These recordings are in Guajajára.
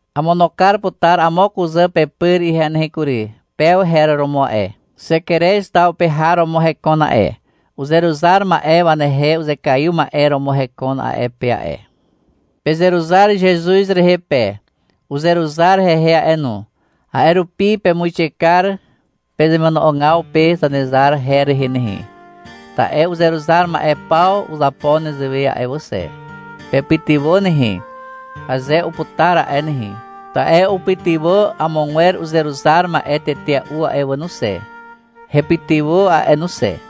Amono kar putar amo kuzà pepyr ihe nehe kury. Pew her romo a'e. Xekerez taw pe har romo hekon a'e. Uzeruzar ma'e wanehe uzekaiw ma'e romo hekon a'e pe a'e. Pezeruzar Zezuz rehe pe. Uzeruzar hehe a'e no. A'e rupi pemuixe kar pezemono'ogaw pe Zanezar her rehe nehe, ta'e uzeruzar ma'e paw uzapo nezewe a'e wà xe. Pepytywà nehe, aze uputar a'e nehe, ta'e upytywà amogwer uzeruzar ma'e tetea'u a'e wà no xe. Hepytywà a'e no xe.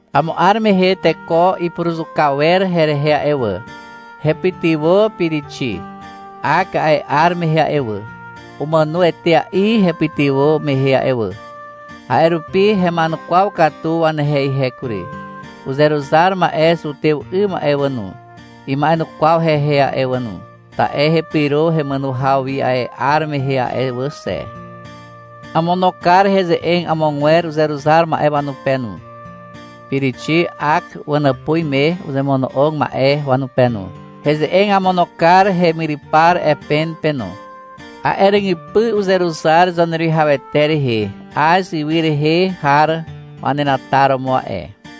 Amo 'ar mehe teko ipuruzuka wer herehe a'e wà. Hepytywà Pirixi, Ak a'e 'ar mehe a'e wà. Umàno etea'i hepytywà mehe wà. A'e rupi hema'enukwaw katu wanehe ihe kury. Uzeruzar ma'e zutew 'ym a'e wà no, ima'enukwaw hehe a'e wà no, ta'e hepyro hemàno haw wi a'e 'ar mehe a'e wà xe. Amono kar heze'eg amogwer uzeruzar ma'e wanupe no, Pirixi Ak wanàpuz me uzemono'og ma'e wanupe no. Heze'eg amono kar hemyrypar Epen pe no. A'e ràgypy uzeruzar Zaneruwihawete rehe Az ywy rehe har wanenataromo a'e.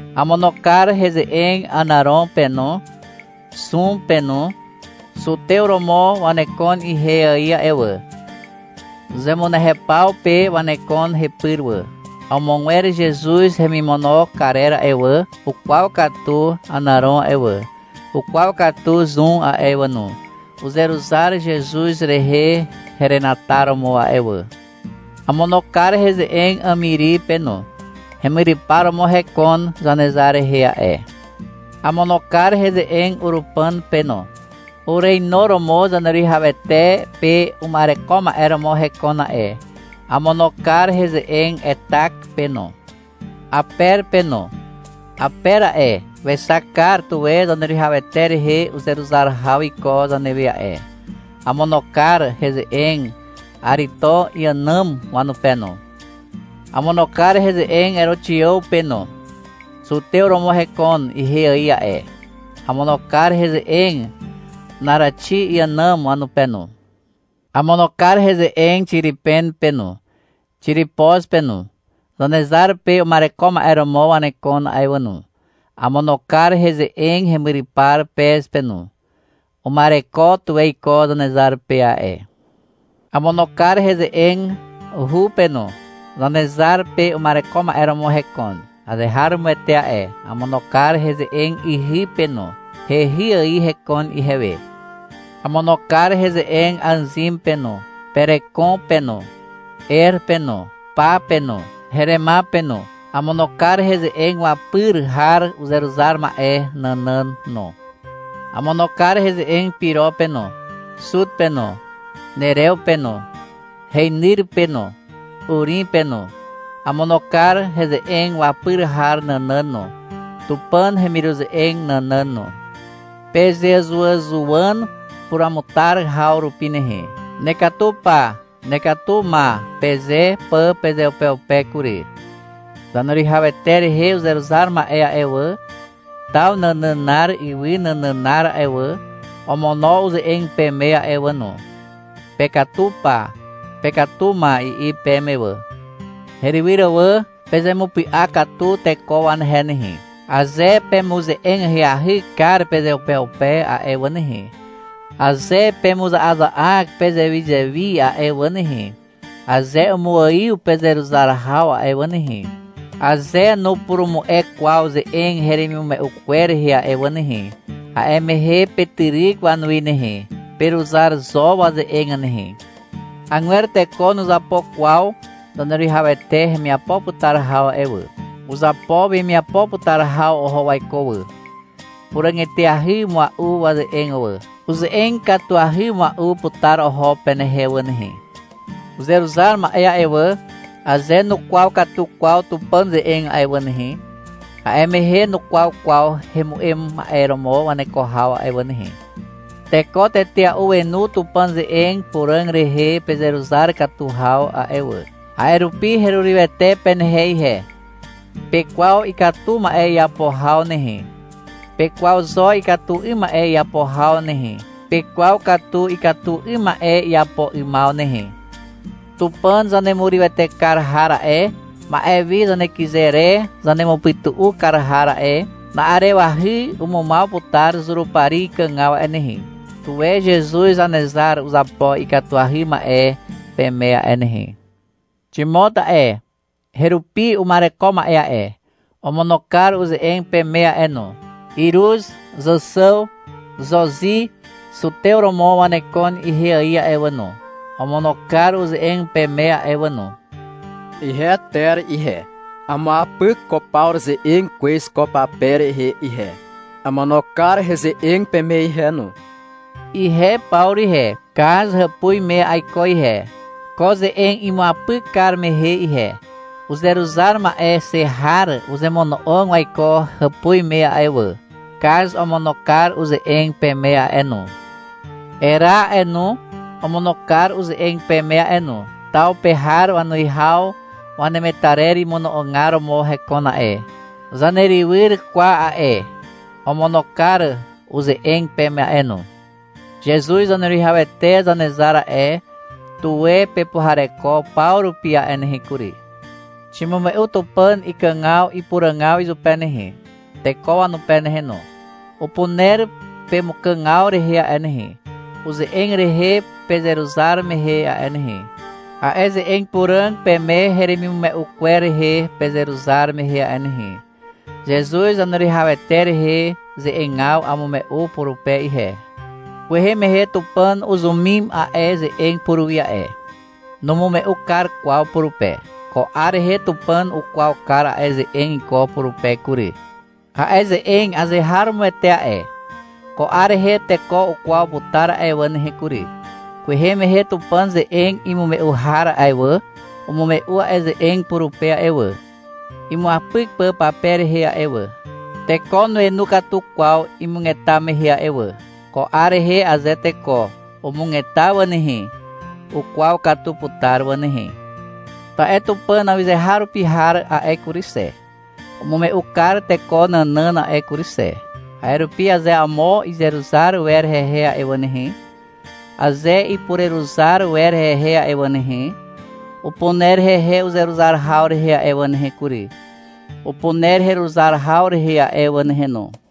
Amono kar heze'eg Ànàron pe no, Zun pe no. Zutew romo wanekon ihe ài a'e wà. Zemunehepaw pe wanekon hepyr wà. Amogwer Zezuz hemimono karer a'e wà, ukwaw katu Ànàron a'e wà, ukwaw katu Zun a'e wà no. Uzeruzar Zezuz rehe herenataromo a'e wà. Amono kar heze'eg Àmiri pe no. Hemyrypar romo hekon Zanezar rehe a'e. Amono kar heze'eg Urupàn pe no. Ureinuromo Zaneruwihawete pe uma'ereko ma'e romo hekon a'e. Amono kar heze'eg Etak pe no, Aper pe no. Aper a'e, wexak kar tuwe Zaneruwihawete rehe uzeruzar haw iko zanewe a'e. Amono kar heze'eg Arito iànàm wanupe no. Amono kar heze'eg Eroxiàw pe no. Zutew romo hekon ihe ài a'e. Amono kar heze'eg Naraxi iànàm wanupe no. Amono kar heze'eg Xiripen pe no, Xiripoz pe no. Zanezar pe uma'ereko ma'e romo wanekon a'e wà no. Amono kar heze'eg hemyrypar Pez pe no. Uma'ereko tuwe iko Zanezar pe a'e. Amono kar heze'eg Hu pe no. Zanezar pe uma'ereko ma'e romo hekon azeharomoete a'e. Amono kar heze'eg ihy pe no. Hehy ài hekon ihewe. Amono kar heze'eg Àzin pe no, Perekon pe no, Er pe no, Pa pe no, Herema pe no. Amono kar heze'eg wapyr har uzeruzar ma'e nànàn no. Amono kar heze'eg Piro pe no, Zut pe no, Nerew pe no, heinyr pe no, Urim pe no. Amono kar heze'eg wapyr har nànàn no, Tupàn hemiruze'eg nànàn no. Pezeàzuwàzuwàn puruamutar haw rupi nehe, — Nekatu pa, nekatu ma, peze pà pezeupeupe kury. Zaneruwihawete rehe uzeruzar ma'e a'e wà, taw nànànar ywy nànànar a'e wà, omono uze'eg peme a'e wà no, — Pekatu pa, pekatu ma, i'i peme wà. Herywyr wà, pezemupy'a katu teko wanehe nehe. Aze pemuze'eg ahyahy kar pezeupeupe a'e wà nehe, aze pemuza'aza'ak pezewizewi a'e wà nehe, aze umuaiw pezeruzar haw a'e wà nehe, aze nupurumu'e kwaw ze'eg heremimume'u kwer rehe a'e wà nehe, a'e mehe petyryk wanuwi nehe. Peruzar zo waze'eg nehe. Agwer teko nuzapo kwaw Zaneruwihawete hemiapo putar haw a'e wà. Uzapo wemiapo putar haw oho waiko wà. Puràg eteahy mua'u waze'eg wà. Uze'eg katuahy mua'u putar oho penehe wà nehe. Uzeruzar ma'e a'e wà, aze nukwaw katu kwaw Tupàn ze'eg a'e wà nehe, a'e mehe nukwaw kwaw hemu'em ma'e romo waneko haw a'e wà nehe. Teko tetea'u wenu Tupàn ze'eg puràg rehe pezeruzar katu haw a'e wà. A'e rupi herurywete penehe ihe. Pekwaw ikatu ma'e iapo haw nehe. Pekwaw zo ikatu 'ym ma'e iapo haw nehe. Pekwaw katu ikatu 'ym ma'e iapo 'ymaw nehe. Tupàn zanemurywete kar har a'e, ma'e wi zanekyze re zanemupytu'u kar har a'e, na'arewahy umumaw putar Zurupari ikàgaw a'e nehe. Tuwe Zezuz Zanezar uzapo ikatuahy ma'e peme a'e nehe. Ximot a'e, herupi uma'ereko ma'e a'e, omono kar uze'eg peme a'e no. Iruz, Zàxàw, Xozi. Zutew romo wanekon ihe ài a'e wà no, omono kar uze'eg peme a'e wà no. Ihe Ter ihe, amuapyk ko Pawru ze'eg kwez ko pape rehe ihe. Amono kar heze'eg peme ihe no. Ihe Pawru ihe, Kaz hàpuz me aiko ihe, ko ze'eg imuapyk kar mehe ihe. Uzeruzar ma'e xe har uzemono'og waiko hàpuz me a'e wà. Kaz omono kar uze'eg peme a'e no. Era a'e no, omono kar uze'eg peme a'e no. Taw pe har wanuwihaw wanemetarer imono'ogar romo hekon a'e. Zanerywyr Kwa a'e, omono kar uze'eg peme a'e no. Zezuz Zaneruwihawete Zanezar a'e, tuwe pepuhareko paw rupi a'e nehe kury. Ximume'u Tupàn ikàgaw ipuràgaw izupe nehe, teko wanupe nehe no. Upuner pemukàgaw rehe a'e nehe, uze'eg rehe pezeruzar mehe a'e nehe, a'e ze'eg puràg peme heremimume'u kwer rehe pezeruzar mehe a'e nehe. Zezuz Zaneruwihawete rehe ze'egaw amume'u purupe ihe. Kwehe mehe Tupàn uzumim a'e ze'eg puruwi a'e. Numume'u kar kwaw purupe. Ko 'ar rehe Tupàn ukwaw kar a'e ze'eg iko purupe kury. A'e ze'eg azeharomoete a'e. Ko 'ar rehe teko ukwaw putar a'e wà nehe kury. Kwehe mehe Tupàn ze'eg imume'u har a'e wà, umume'u a'e ze'eg purupe a'e wà, imuapyk pà pape rehe a'e wà. Teko nuenu katu kwaw imugeta mehe a'e wà. Ko 'ar rehe aze teko umugeta wà nehe, ukwaw katu putar wà nehe. Ta'e Tupàn awyzeharupi har a'e kury xe, umume'u kar teko nànàn a'e kury xe. A'e rupi aze amo izeruzar wer hehe a'e wà nehe, aze ipureruzar wer hehe a'e wà nehe, upuner hehe uzeruzar haw rehe a'e wà nehe kury, upuner heruzar haw rehe a'e wà nehe no.